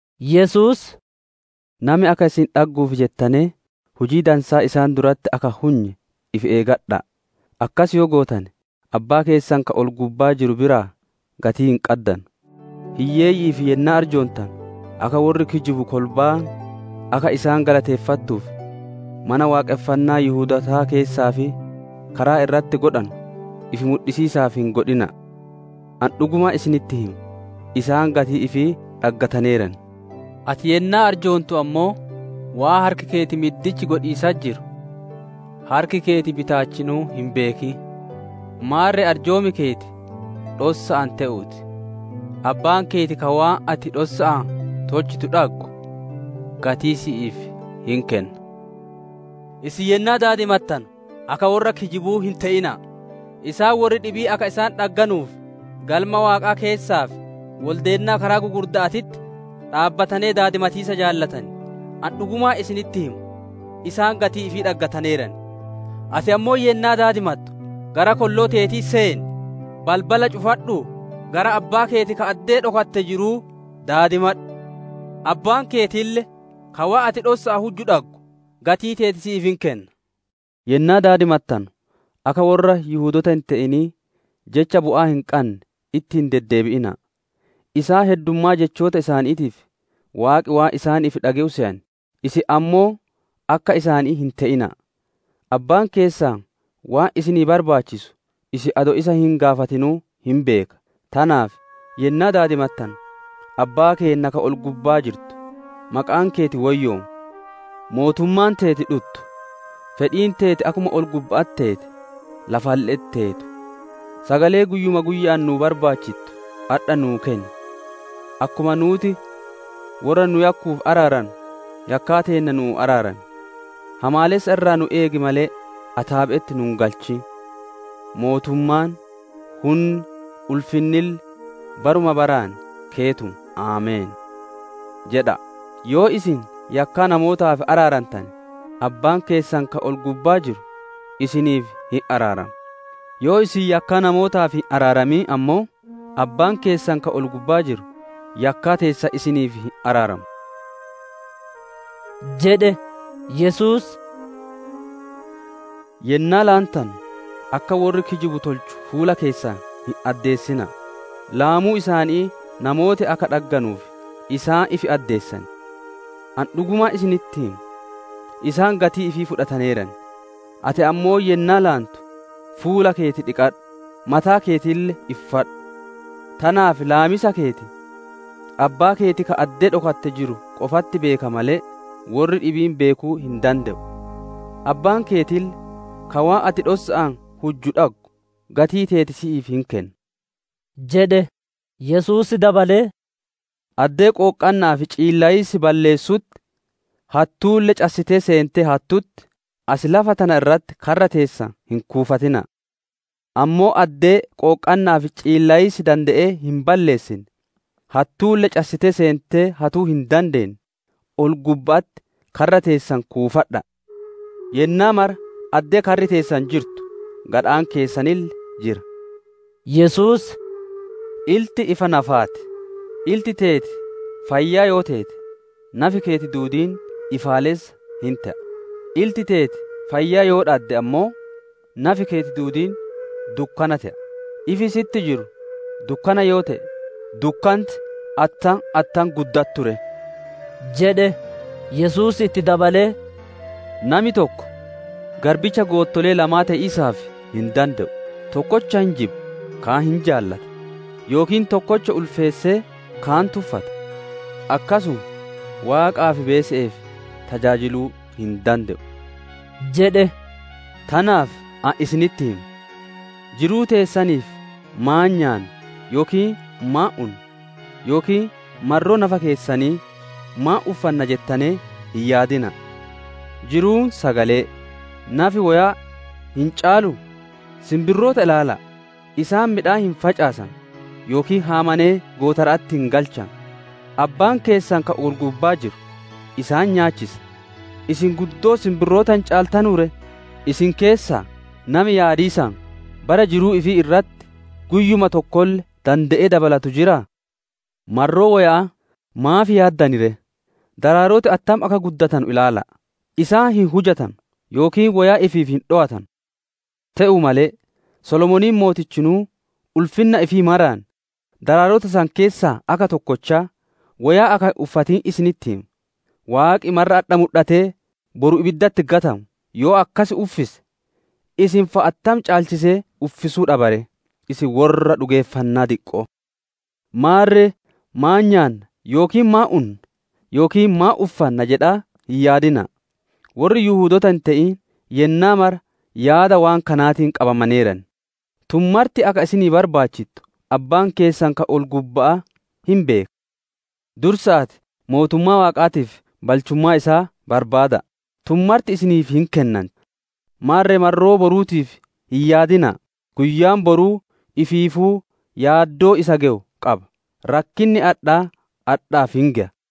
Yesuus, «Nami akka isin dhagguuf jettanee hujii dansaa isaan duratti akka hin hunye ifi eeggadha'a! Akkas yoo gootane, Abbaa keessan ka ol-gubbaa jiru biraa gatii hin qaddanu. «Hiyyeeyyi'iif yennaa arjoontanu, akka worri kijibu kolbaan akka isaan galateeffattuuf, Mana Waaqonfannaa Yihudootaa keessaa fi karaa irratti godhanu, ifi mudhisiisaaf hin godhina'a. Ani dhugumaan isinitti hima, isaan gatii ifii dhaggataneeran. Ati yennaa arjoontu ammoo, waan harki keeti middichi godhiisatti jiru harki keeti bitaachinuu hin beekin. Maarre arjoom keeti dhossa'aan te'uu ti; Abbaan keeti ka waan ati dhossa'aan tolchitu dhaggu, gatii si'iif hin kenna. «Isin yennaa daadimattanu, akka worra kijibuu hin te'ina'a! Isaan worri dhibiin akka isaan dhagguuf, Galma Waaqaa keessaa fi woldeennaa karaa gugurda'aatitti dhaabbatanee daadimatiisa jaalatan. Ani dhugumaan isinitti hima, isaan gatii ifii dhaggataneeran. Ati ammoo yennaa daadimattu, gara kolloo teetii seen, balbala cufadhuu, gara Abbaa keeti ka addee dhokatte jiruu daadimadhu. Abbaan keetille, ka waan ati dhossa'aan huju dhaggu, gatii teeti si'iif hin kenna. «Yennaa daadimattanu akka worra Yihudoota hin te'inii, jecha bu'aa hin qanne itti hin deddeebi'ina'a; isaan heddummaa jechoota isaaniitiif, waaqi waan isaaniif dhage'u seyan. Isin ammoo akka isaanii hin te'ina'a. Abbaan keessan waan isin barbaachisu isin adoo isa hin gaafatinuu hin beeka. «Tanaaf, yennaa daadimattanu, «‹Abbaa keenna ka ol-gubbaa jirtu, Maqaan keeti woyyoomu; mootummaan teeti dhuttu; fedhiin teeti akkuma ol-gubba'atti teete, lafalle'etti teetu. Sagalee guyyuma guyya'aan nuu barbaachittu adha nuu kenni. Akkuma nuuti worra nu yakkuuf araarannu, yakkaa teenna nuu araarami. Hamaalessa irraa nu eegi malee, ataabe'etti nu hin galchin. [Mootummaan, hunni, ulfinnille baruma baraan keetuma. Ameen]› jedha'a. «Yoo isin yakkaa namootaaf araarantane, Abbaan keessan ka ol-gubbaa jiru isiniif hin araarama. Yoo isin yakkaa namootaaf hin araaramin ammoo, Abbaan keessan ka ol-gubbaa jiru yakkaa teessan isiniif hin araaramu» jedhe. Yesuus, «Yennaa laantanu, akka worri kijibu tolchu fuula keessan hin addeessina'a. Laamuu isaanii namooti akka dhagganuuf isaan ifi addeessan. Ani dhugumaan isinitti hima, isaan gatii ifii fudhataneeran. Ati ammoo yennaa laantu, fuula keeti dhiqadhu, mataa keetille iffadhu! Tanaaf laamiisa keeti, Abbaa keeti ka addee dhokatte jiru qofatti beeka malee, worri dhibiin beekuu hin dande'u. Abbaan keetille, ka waan ati dhossa'aan hujju dhaggu, gatii teeti si'iif hin kenna» jedhe. Yesuus dabalee, «Addee qooqqanna'aa fi ciillayiisi balleessutti, hattuulle cassitee seentee hattutti, as lafa tana irratti karra teessan hin kuufatina'a. Ammoo addee qooqqanna'aa fi ciillayiisi dande'ee hin balleessine, hattuulle cassitee seentee hatuu hin dandeenne, ol-gubba'atti karra teessan kuufadha'a. Yennaa mara addee karri teessan jirtu gadhaan keessanille jira» jedhe. Yesuus, «Ilti ifa nafaa ti; ilti teeti fayyaa yoo teete, nafi keeti duudiin ifaalessa hin te'a; ilti teeti fayyaa yoo dhadde ammoo, nafi keeti duudiin dukkana te'a; ifi sitti jiru dukkana yoo te'e, dukkanti attam attam guddattu ree!» jedhe. Yesuus itti dabalee, «Nami tokko garbicha goottolee lamaa te'iisaaf hin dande'u; tokkocha hin jibba, kaan hin jaalata; yookiin tokkocha ulfeessee kaan tuffata. Akkasuma Waaqaa fi beese'eef tajaajiluu hin dande'u» jedhe. «Tanaaf ani isinitti hima, jiruu teessaniif maan nyaanna, yookiin maan unna, yookiin marroo nafa keessanii, maan uffanna jettanee hin yaadina'a. Jiruun sagalee, nafi woyaa hin caaluu? Sinbirroota ilaala'a; isaan midhaan hin facaasanu yookiin haamanee gootara'atti hin galchanu; Abbaan keessan ka ol-gubbaa jiru isaan nyaachisa. Isin guddoo sinbirroota hin caaltanuu ree? Isin keessaa nami yaadiisaan, bara jiruu ifii irratti guyyuma tokkolle ka dande'ee dabalatu jiraa? «Marroo woya'aa maaf yaaddan ree? Daraaroti attam akka guddatanu ilaala'a; isaan hin hujatanu yookiin woyaa ifiif hin dhowatanu. Te'uu malee, Solomooniin mootichinuu ulfinna ifii maraan daraarota san keessaa akka tokkochaa woyaa akka hin uffatin isinitti hima. Waaqi marra adha mudhatee, boru ibiddatti gatamu yoo akkas uffise, isin fa'a attam caalchisee uffisuu dhaba ree? Isin worra dhugeeffannaa diqqo'oo! «Maarre, ‹Maan nyaanna?› yookiin ‹Maan unna?› yookiin ‹Maan uffanna?› jedhaa hin yaaddayina'a; worri Yihudoota hin te'in yennaa mara yaada waan kanaatiin qabamaneeran. Tun marti akka isinii barbaachittu Abbaan keessan ka ol-gubba'aa hin beeka. Dursa'aatii mootummaa Waaqaatii fi balchummaa isaa barbaada'a; tun martinuu isiniif hin kennanti. Maarre marroo boruutiif hin yaadayina'a; guyyaan boruu ifiifuu yaaddoo isa gewu qaba. Rakkinni adhaa adhaaf hin geya» jedhe.